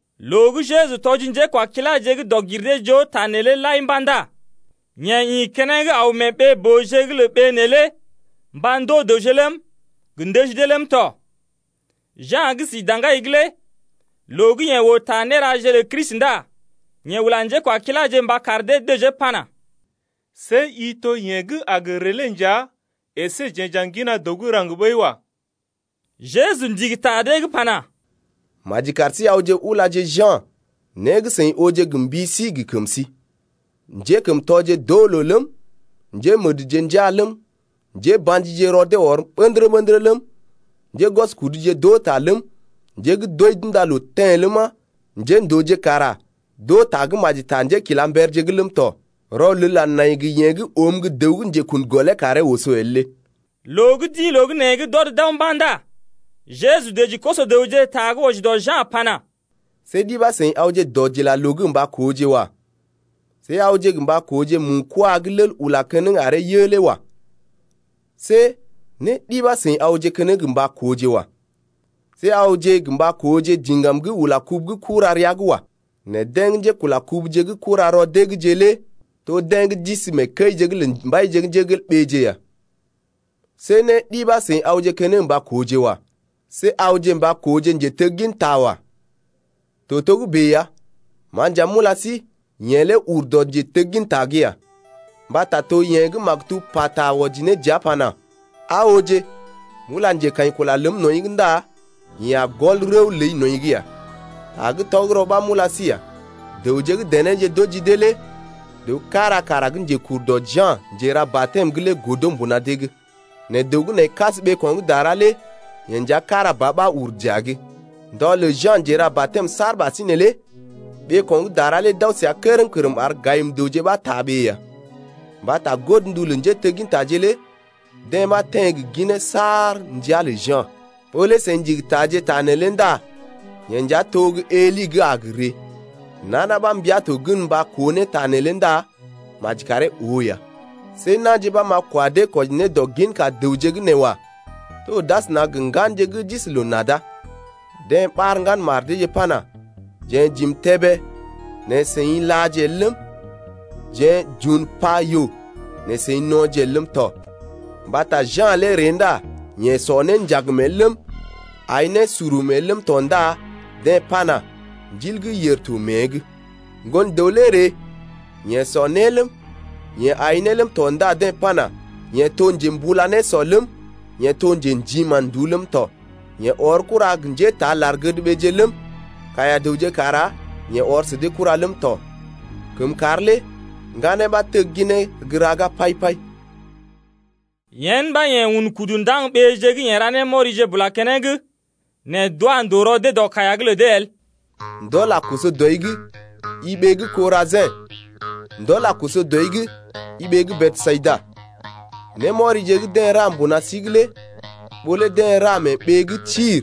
Loo gə́ Jeju tɔji njékwakiláje gə́ dɔg-gir-dee-joo ta neelé lai mba̰ ndá yeḛ ḭ keneŋ aw mee ɓee-booje’g lə ɓee neelé mba ndoo dəwje ləm, gə ndəji dee ləm tɔ. Ja̰ gə́ si daŋgai’g lé loo gə́ yeḛ oo ta néraje lə Kristi lé ndá yeḛ ula njékwakiláje mba kar dee dəjee pana: See i to yeḛ gə́ a gə ree lé nja, əsé jeḛ j’a ŋgina dəw gə́ raŋg ɓəi wa. Jeju ndigi ta dee’g pana: Maji kar sí awje ulaje Ja̰ né gə́ seḭ ooje gə mbi sí gə kəm sí: njékəmtɔje d’oo loo ləm, njémədje njaa ləm, njéba̰jije rɔ dee ɔr ɓə̰dərə-ɓə̰dərə ləm, njégwɔskuduje d’oo ta ləm, njé gə́ d’wəi d’unda loo teḛ ləma, njéndooje kara d’oo tagə́maji lé ta njékilamberje ləm tɔ. Rɔlel a nai gə yeḛ gə́ oom gə́ dəw gə́ njekun gɔlee karee oso el lé. Loo gə́ d’ḭ loo gə́ nee’g d’ɔd d’aw mba̰ ndá Jeju dəji koso-dəwje ta gə́ wɔji dɔ Ja̰ lé pana: See ɗi ɓa seḭ awje dɔdilaloo’g gə mba kooje wa. See awje gə mba kooje mu-kwaa gə́ lel ula keneŋ aree yə lé wa. See né ɗi ɓa seḭ awje keneŋ gə mba kooje wa. See awje gə mba kooje diŋgam gə́ ula kubu gə́ kura rəa’g wa. Nɛ deḛ gə́ njékula kubuje gə́ kura rɔ dee’gje lé to deḛ gə́ d’isi mee kəije’g lə mbaije ya. See né ɗi ɓa seḭ awje keneŋ mba kooje wa. See awje mba kooje njetegginta wa. To togə́bè ya, ma nja m’ula sí, yeḛ lé ur dɔ njetegginta’g ya, Mbata to yeḛ gə́ maktub pata wɔji ne dəa pana: Aa ooje, m’ula njekaḭkula ləm nɔḭ’g ndá yeḛ a gɔl rəw ləi nɔḭ’g ya. Ta gə́ tɔgərɔ ɓa m’ula sí ya, dəwje gə́ denéje d’oji dee lé dəw kára kara gə́ njekur dɔ Ja̰ Njera-batɛm’g lé godo mbuna dee’g. Nɛ dəw gə́ nai kas ɓeeko̰ gə́ dara lé yeḛ nja kára ba ɓa ur dəa’g. Un kudee mee ndɔ’g lə Ja̰ Njera-batɛm saar ɓasinè lé ɓeeko̰ gə́ dara lé d’aw səa kərm-kərm ar njéra-né-kərmje ɓa taa ɓee neelé ya. Mbata godndu lə njéteggintaje lé deḛ ɓa teḛ gə ginee saar ndəa’g lə Ja̰. Ɓó lé seḭ ndigi taaje ta neelé ndá yeḛ nja to gə́ Eli gə́ a gə ree lé. Nana ɓa mbia to gən mba koo ne ta neelé ndá maji karee oo ne ya. See na̰je ɓa m’a kwa dee kwɔji ne dɔ ginka dəwje gə́ nee wa. To d’asəna gə ŋganje gə́ d’isi loo-nada. Deḛ ɓar ŋgan mar deeje pana: Jeḛ j’im tébé nɛ seḭ làje ne el ləm, jeḛ j’un pa yoo nɛ seḭ no̰je ne el ləm tɔ. Mbata Ja̰ lé ree ndá yeḛ sɔ né njagm el ləm, ai né surum el ləm tɔ ndá deḛ pana: Ndil gə́ yèr to mée’g. Ŋgon-dəw lé ree, yeḛ sɔ né ləm, yeḛ aḭ né ləm tɔ ndá deḛ pana: Yeḛ to njembula nésɔ ləm yeḛ to njḛdi mán-nduú ləm tɔ. Yeḛ ɔr kura gə́ njétaa lar-gədɓeeje ləm, kaiya-dəwje kara yeḛ ɔr sə dee kura ləm tɔ. Kəmkàr lé ŋganeeje ɓa tegginee gə́ raga pai-pai. Yen ɓa yeḛ un kudu ndaŋg ɓeeje gə́ yeḛ ra némɔrije bula keneŋ nɛ d’wa ndòo rɔ dee dɔ kaiya’g lə dee el. Ndɔl a koso dɔi’g, i ɓee gə́ Korajḭ! ndɔl a koso dɔi’g, i ɓee gə́ Besayida. Némɔrije gə́ deḛ ra mbuna sí’g lé ɓó lé deḛ ra mee ɓeeje gə́ Tir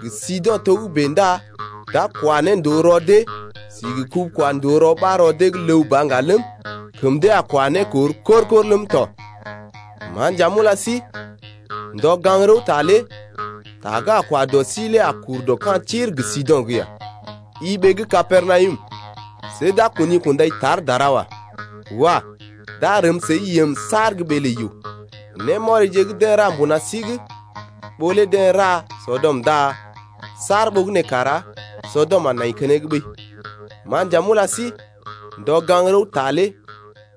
gə Sido̰ togə́bè ndá d’a kwa ne ndòo rɔ dee si gə kubu-kwa-ndòo ɓa rɔ dee’g ləw ba ŋga ləm, kəm dee a kwa ne kor kor-kor ləm tɔ. Ma nja m’ula sí, ndɔ gaŋg-rəwta lé ta gə́ a kwa dɔ sí lé a kur dɔ ka̰ Tir gə Sido̰’g ya. I ɓee gə́ Kapernawum, see d’a kuni kundai tar dara wa. Wah! D’a rəm səi yəm saar gə́ ɓee lə yoo. Némɔrije gə́ deḛ ra mbuna sí’g, ɓó lé deḛ ra Sɔdɔm ndá saar ɓogənè kara Sɔdɔm a nai keneŋ ɓəi. Ma nja m’ula sí, ndɔ gaŋg-rəwta lé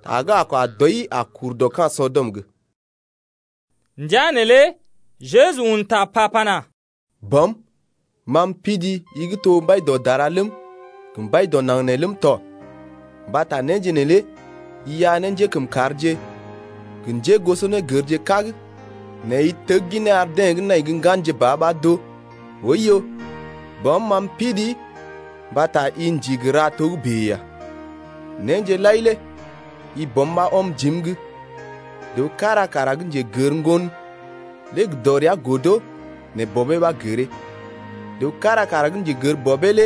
ta gə́ a kwa dɔi a kur dɔ ka̰ Sɔdɔm’g. Ndəa neelé Jeju un ta pa pana: Bɔm, ma m’pidii, i gə́ to Mbai dɔ dara ləm, gə Mbai dɔ naŋg nee ləm tɔ mbata néje neelé i iya ne njékəmkàrje gə njégosonégərje kág nɛ i tegginee ar deḛ gə́ nai gə́ ŋganje ba ɓa d’oo. Oiyo, Bɔm, ma m’pidii mbata i ndigi ra togə́bè ya. Néje lai lé i Bɔm ɓa ɔm jim’g. Dəw kára kara gə́ njegər Ŋgon lé gə dɔrea godo nɛ Bɔbee ɓa gəree. Dəw kára kara gə́ njegər Bɔbee lé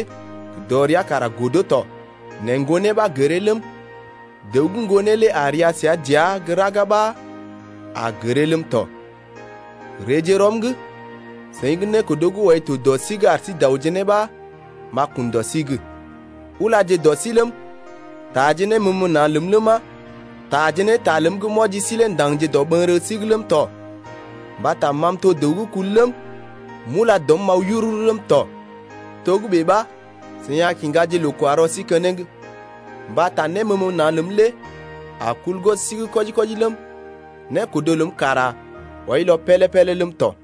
gə dɔrea kara godo tɔ nɛ Ŋgonee ɓa gəree ləm, dəw gə́ Ŋgonee lé a ria səa dəa gə́ raga ɓa a gəree ləm tɔ. Reeje rɔm’g, seḭ gə́ nékodo gə́ wɔi to dɔ sí’g ar sí daoje ne ɓa m’a kun dɔ sí’g. Ulaje dɔ sí ləm, taaje néməməna̰ ləm ləma, taaje ne ta ləm gə́ m’wɔji sí lé ndaŋgje dɔɓəŋgərə sí’g ləm tɔ mbata ma m’to dəw gə́ kul ləm, m’ula dɔm m’aw yururu ləm tɔ. Togə́bè ɓa seḭ a kiŋgaje loo-kwa-rɔ sí keneŋ. Mbata néməməna̰ ləm lé a kul gwɔb sí’g kwɔji-kwɔji ləm, nékodo ləm kara wɔilɔ pélé-pélé ləm tɔ.